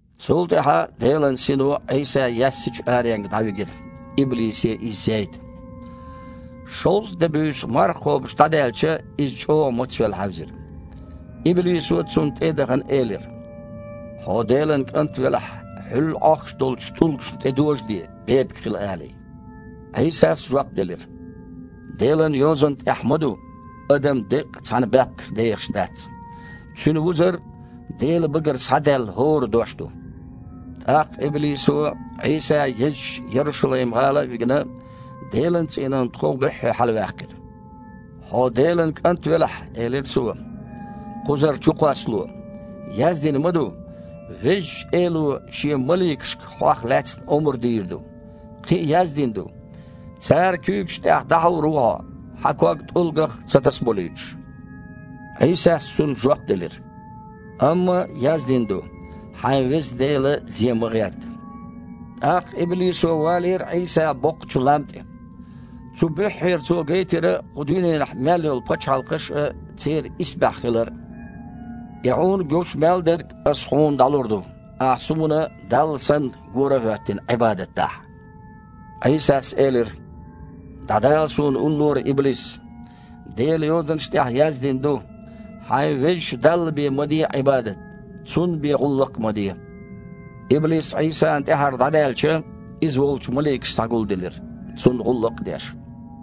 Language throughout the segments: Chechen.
Цул тІаьхьа Делан Сино Іийса яьссачу аренга дІавигира, иблисе Иза зейта. Шовзткъа де-буьйса марха кхобуш дІадаьлча, Иза чІогІа мацвелла хьаьвзира. Иблисо, Цунна тІе а дахана, элира: «Хьо Делан КІант велахь, хьуьлла Іохкуш долчу тІулгашна тІедожаде, бепиг хила алий». Іийсас жоп делира: «Делан Йозанна тІехь ма ду: „Адам деккъа цхьана баьпках дехаш дац. Цуьнан вузар – Делан багара схьадаьлла хІора дош ду“». ТІаккха иблисо, Іийса езачу Ярушалайм-гІала а вигина, Делан цІийнан тхов буьххье хьалаваьккхира. «Хьо Делан КІант велахь, – элира цо, – кхузара чукхоссало. Яздина ма ду: „Везачу Эло Шен маликашка Хьох лаьцна омра дийр ду“. Кхин а яздина ду: „Цара куьйгаш тІехь дІахьур ву хьо, хьан ког тІулгах а ца тасаболуьйтуш“». Іийсас цунна жоп делира: «Амма яздина ду: „Хьайн Веза Дела зе ма гІерта“». ТІаккха иблисо валийра Іийса боккхачу лам тІе. Цу буьххьера цо гайтира кху дуьненахь мел йолу пачхьалкхаш а, церан исбаьхьа хилар а. «И Хьуна гуш мел дерг аса Хьуна дІалур ду, Ахьа суна, Далла санна, гора а хІоьттина, Іибадат дахь!» Іийсас элира: «ДІадала Суна уллора, иблис! Делан Йозанаш тІехь яздина ду: „Хьайн Везачу Далла бен ма де Іибадат, Цунна бен гІуллакх а ма де!“» Иблис Іийсана тІаьхьара дІадаьлча, Иза волчу маликаш схьагулделира, Цунна гІуллакх а деш.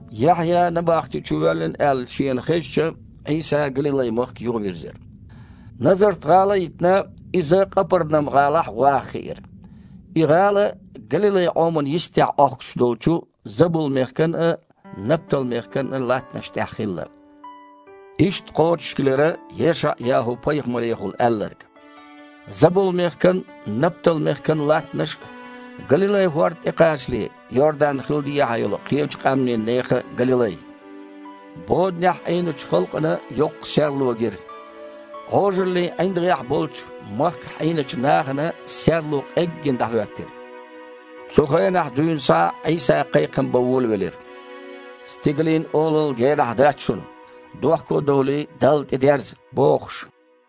Яхьъя набахти чу воьллина аьлла Шена хезча, Іийса Галилай-махка юхавирзира. Назарт-гІала а йитина, Иза Къапарнам-гІалахь ваха хиира. И гІала Галилай-Іомана йистехь Іохкуш долчу Забул-мехкан а, Наптал-мехкан а латтанаш тІехь хилла. Иштта кхочушхилира ЕшаІ-ЯхІу-пайхамарехула аьлларг: «Забул-мехкан а, Наптал-мехкан а латтанаш а, Галилай-хІорда тІекхачале, Йордан-хил дехьа йолу кхечу къаьмнийн нехан Галилай! Боданехь Іийначу халкъана йоккха серло гира! Іожаллин ІиндагІехь болчу махкахь Іийначу нахана серло къеггина дІахІоьттира!» Цу хенахь дуьйна схьа Іийса кхайкхам бан волавелира: «Стигалийн Олалла генахь дац шуна! Дохко а довлий, Далла тІедерза!» – бохуш.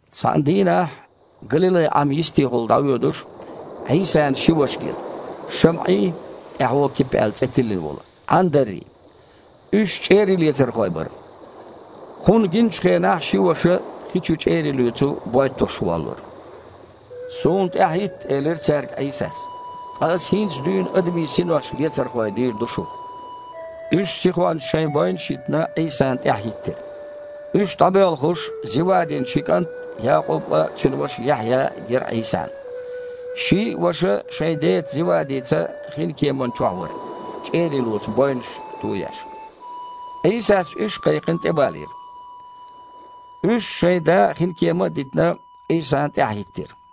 Цхьана дийнахь, Галилай-Іам йистехула дІавоьдуш, Іийсана ши ваша гира: ШамІий, тІаьхьо Кипа аьлла цІе тиллина волу, Іандаррий. Уьш чІерийлецархой бара. Кхунна гиначу хенахь ши ваша хи чу чІерий лоьцу бой тосуш воллура. «Суна тІаьхьахІитта, – элира цаьрга Іийсас, – ткъа Аса хІинца дуьйна адамийн синош лецархой дийр ду шух». Уьш, сихонца шайн бойнаш а йитина, Іийсана тІаьхьахІиттира. Уьш дІабоьлхуш, Зевадин ши кІант – Якъуб а, цуьнан ваша Яхьъя а гира Іийсана. Ший а ваша шайн деца Зевадица хинкеман чохь вара, чІерий лоцу бойнаш тоеш. Іийсас уьш а кхайкхина тІебалийра. Уьш, шайн да а, хинкема а дитина, Іийсана тІаьхьахІиттира.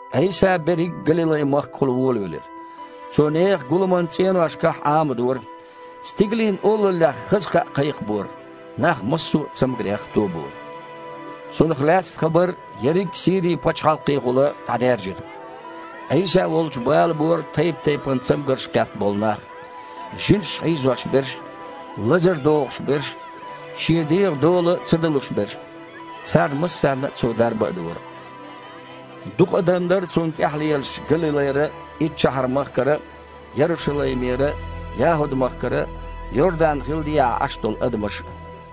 Іийса берриг Галилай-махкахула волавелира. Цо нехан гуламан цІеношкахь Іамадора, Стигалийн Олаллех хаза кхаъ кхайкхабора, нах массо а цамгарех тобора. Цунах лаьцна хабар ерриг Сири-пачхьалкхехула дІадаьржира. Іийса волчу блабора тайп-тайпана цамгарш кхетта болу нах: жинаша хьийзош берш а, лазар догІуш берш а, шен дегІан дола ца далуш берш а. Царна массарна а Цо дарба а дора. Дукха адам дара Цунна тІаьхьа лелаш Галилайра а, Иттшахьар-махкара а, Ярушалаймера а, ЯхІуд-махкара а, Йордан-хил дехьа Іаш долу адамаш а.